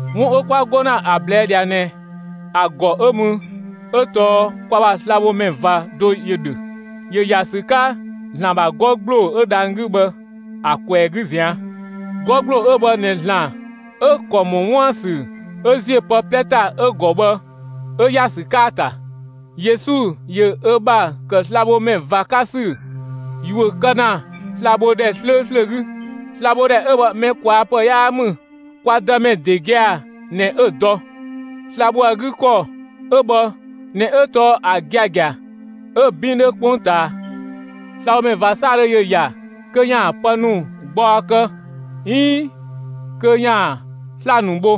'Wun 'ö 'kwa 'go ‑na ‑a ꞊blɛɛ' ꞊dhia ꞊nɛ ‑a ‑gɔ 'ö mü 'ö tɔɔ kwa ‑bha slabhomɛ ꞊va do ‑yö ‑dhö; ‑yö ‑ya ‑sü 'ka ‑Zlan ‑bha 'gɔ ‑gbloo 'ö dhang‑ 'gü bhë ‑a ꞊kwɛɛ‑ 'gü ꞊zian'. 'Gɔ ‑gbloo 'ö bhë ꞊nɛ ‑Zlan 'ö ‑kɔ ‑mɔ 'wuën‑ ‑sü 'ö ‑ziö pë 'plɛ ‑ta ‑a ‑gɔ bhë 'ö ‑ya ‑sü 'ka ‑a ‑ta. Yesu ‑yö ö ‑bha ‑kë slabhomɛ ꞊va 'ka ‑sü ‑yuö kë ‑na slabhodhɛ 'slööslö 'gü. Slabhodhɛ 'ö bhë mɛ ꞊kwaa' ‑pë 'yaa ‑mü. Kwa Dëmɛ ‑de gia‑ ꞊nɛ 'ö‑ dɔ. Sla‑ ‑bho ‑a 'gü ‑kɔ 'ö bhë ꞊nɛ 'ö tɔɔ ‑a giagia 'ö‑ 'bin 'dhö 'kpongtaa. Slabhomɛ ꞊va 'saadhö ‑yö ‑ya kö ‑yaan pë ‑nu gbaɔ kë 'iin kö ‑yaan sla‑ ‑nu bho;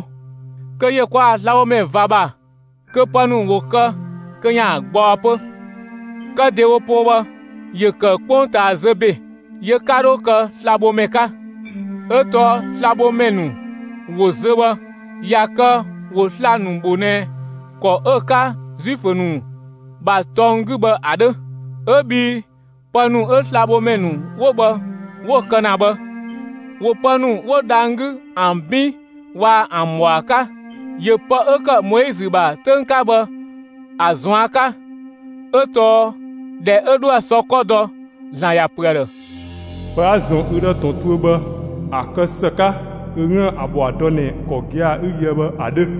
kö ‑yö kwa ‑bha slabhomɛ ꞊va ‑bha kö pë ‑nu ‑wo kë kö ‑yaan gbaɔ 'pö. Kë ‑dewo poo bhë, ‑yö ‑kë 'kpongtaa zö ‑be, yö 'ka 'dho kë slabhomɛ 'ka; 'ö tɔɔ slabhomɛ ‑nu ‑wo zö bhë, ꞊ya kë ‑wo sla‑ ‑nu bho ꞊nɛ ‑kɔ 'ö‑ 'ka Zuifö ‑nu ‑bha tɔng 'gü bhë ‑a 'dhö. 'Ö bhii pë ‑nu 'ö slabhomɛ ‑nu 'wo bhë 'wo‑ kë ‑na bhë, ‑wo pë ‑nu 'wo dhang‑ 'gü ‑an 'bin waa‑ ‑an ‑bhɔa 'ka; ‑yö pë 'ö ‑kë Moizö ‑bha 'töng 'ka bhë ‑a ꞊zuan' 'ka, 'ö tɔɔ ‑dhɛ 'ö 'dhoë‑ sɔ 'kɔ dɔ, ‑Zlan ‑ya ‑pö ‑a ‑dhë: Pë 'a‑ ‑zɔn ü ‑dhë ‑tɔn tuö bhë, ‑a kë ‑së 'ka kö 'üën‑ ‑a ‑bhɔa dɔ ꞊nɛ ‑kɔ gia‑ 'ü‑ yöë bhë ‑a 'dhö.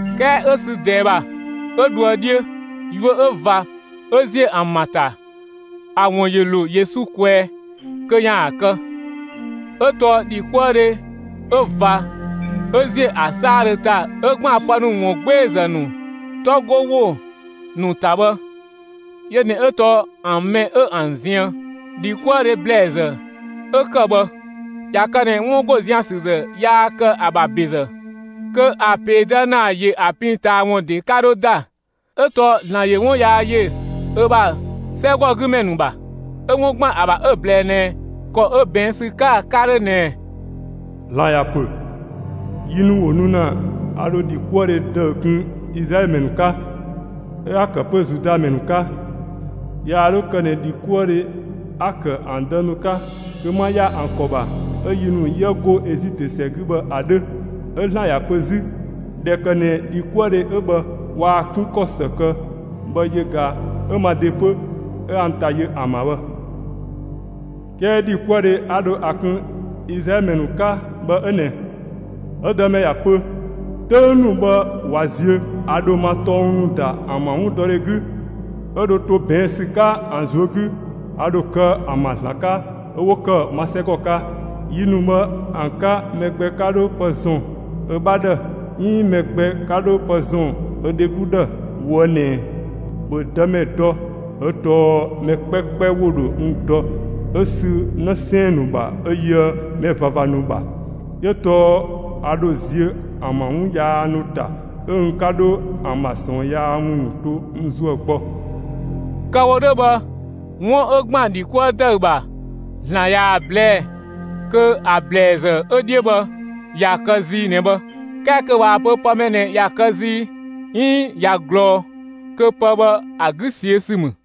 'Kɛɛ 'ö sü ꞊dɛɛ ‑bha, 'ö dhoë 'dhiö, yuö 'ö ꞊va 'ö ‑ziö ‑an ‑bha ‑ta, ‑a ‑wun ‑ya ‑lo Yesu kwɛɛ kö ‑yaan kë. 'Ö tɔɔ ‑dhikuëdhe 'ö ꞊va 'ö ‑ziö ‑a 'saadhö ‑ta 'ö ‑gban pë ‑nu ‑wungbeezë ‑nu 'tɔ 'go ‑wo ‑nu ‑ta bhë, yö ꞊nɛ 'ö tɔɔ ‑an mɛ 'ö ‑an ziën. ‑Dhikuëdhe ‑blɛɛzë 'ö ‑kë bhë, ꞊ya kë ꞊nɛ 'wun ‑go zian‑ ‑sü ‑zë yaa kë ‑a ‑bha ‑bezë, kö ‑a ‑peedë ‑naa ‑yö ‑a pin ꞊taa ‑wun ‑de 'ka 'dhö ‑da. 'Ö tɔɔ ‑Zlan ‑yö 'wun yaa ‑yö ö ‑bha 'sɛgɔgümɛ ‑nu ‑bha, 'ö 'wun ‑gban ‑a ‑bha 'ö‑ ꞊blɛɛ ꞊nɛ ‑kɔ 'ö ꞊bɛɛn' ‑sü 'ka‑ 'ka‑ 'dhö ꞊nɛ: ‑Zlan ‑ya ‑pö: Yi ‑nu ‑wo nu ‑na 'a dho ‑dhikuëdhe ‑dëü kun Izlaɛlö ‑mɛ ‑nu 'ka, 'ö 'a‑ ‑kë 'pö Zuda ‑mɛ ‑nu 'ka. Yaa 'dho kë ꞊nɛ ‑dhikuëdhe 'a‑ ‑kë ‑an dë ‑nu 'ka kö 'ma ‑ya ‑an ‑kɔ ‑bha 'ö yi ‑nu 'yië go Ezitö ‑sɛ 'gü bhë ‑a 'dhö. 'Ö ‑Zlan ‑ya pö 'zü: ‑Dhɛ ‑kë ꞊nɛ ‑dhikuëdhe 'ö bhë waa‑ 'kun ‑kɔ ‑së kë bhë, yö ꞊ga 'ö ma ‑de 'pö 'ö 'a n ‑ta yö ‑an ‑bha bhë. 'Kɛɛ ‑dhikuëdhe 'a dho ‑a kun Izlaɛlö ‑mɛ ‑nu 'ka bhë 'ö ꞊nɛ; 'ö Dëmɛ ‑ya pö: 'Töng ‑nu bhë ꞊wa ziö, a ‑dho ma tɔng ‑nu ‑da ‑an ‑bha 'wundɔdhe 'gü, 'ö dho to ꞊bɛɛn' ‑sü 'ka ‑an ꞊zuö' 'gü. A ‑dho kë ‑an ‑bha ‑Zlan 'ka, 'ö 'wo ‑kë ma 'sɛgɔ 'ka. Yi ‑nu bhë ‑an 'ka, mɛ gbɛ 'ka 'dho pë ‑zɔn ö 'bha ‑dhë, 'iin mɛ gbɛ 'ka 'dho pë ‑zɔn 'ö dheglu ‑dhë ꞊woë' ꞊nɛɛ: ‑Bhö Dëmɛ dɔ! 'Ö tɔɔ, mɛ 'kpɛkpɛ ‑wo ‑dho n dɔ 'ö sü 'në 'sɛɛn‑ ‑nu ‑bha 'ö yöë mɛ ꞊vava ‑nu ‑bha. 'Yö tɔɔ a ‑dho ziö ‑an ‑bha 'wun yaa ‑nu ‑ta; 'ö n 'ka 'dho ‑an ‑bha ꞊sɔɔnyaa ‑wun ‑nu to n ‑zuë gbɔ. Kë‑ wo 'dhö bhë, 'wun 'ö ‑gban ‑dhi 'kuë ‑dëü ‑bha, ‑Zlan ꞊yaa‑ ꞊blɛɛ' kö ‑a ‑blɛɛzë 'ö 'dhiö bhë ꞊ya kë zii ꞊nɛ bhë; 'kɛɛ kö ꞊waa‑ pö pë mɛ ꞊nɛ ꞊ya kë zii 'iin ꞊ya ꞊glɔɔ, kö pë bhë ‑a 'gü ꞊siö' ‑sü ‑mü.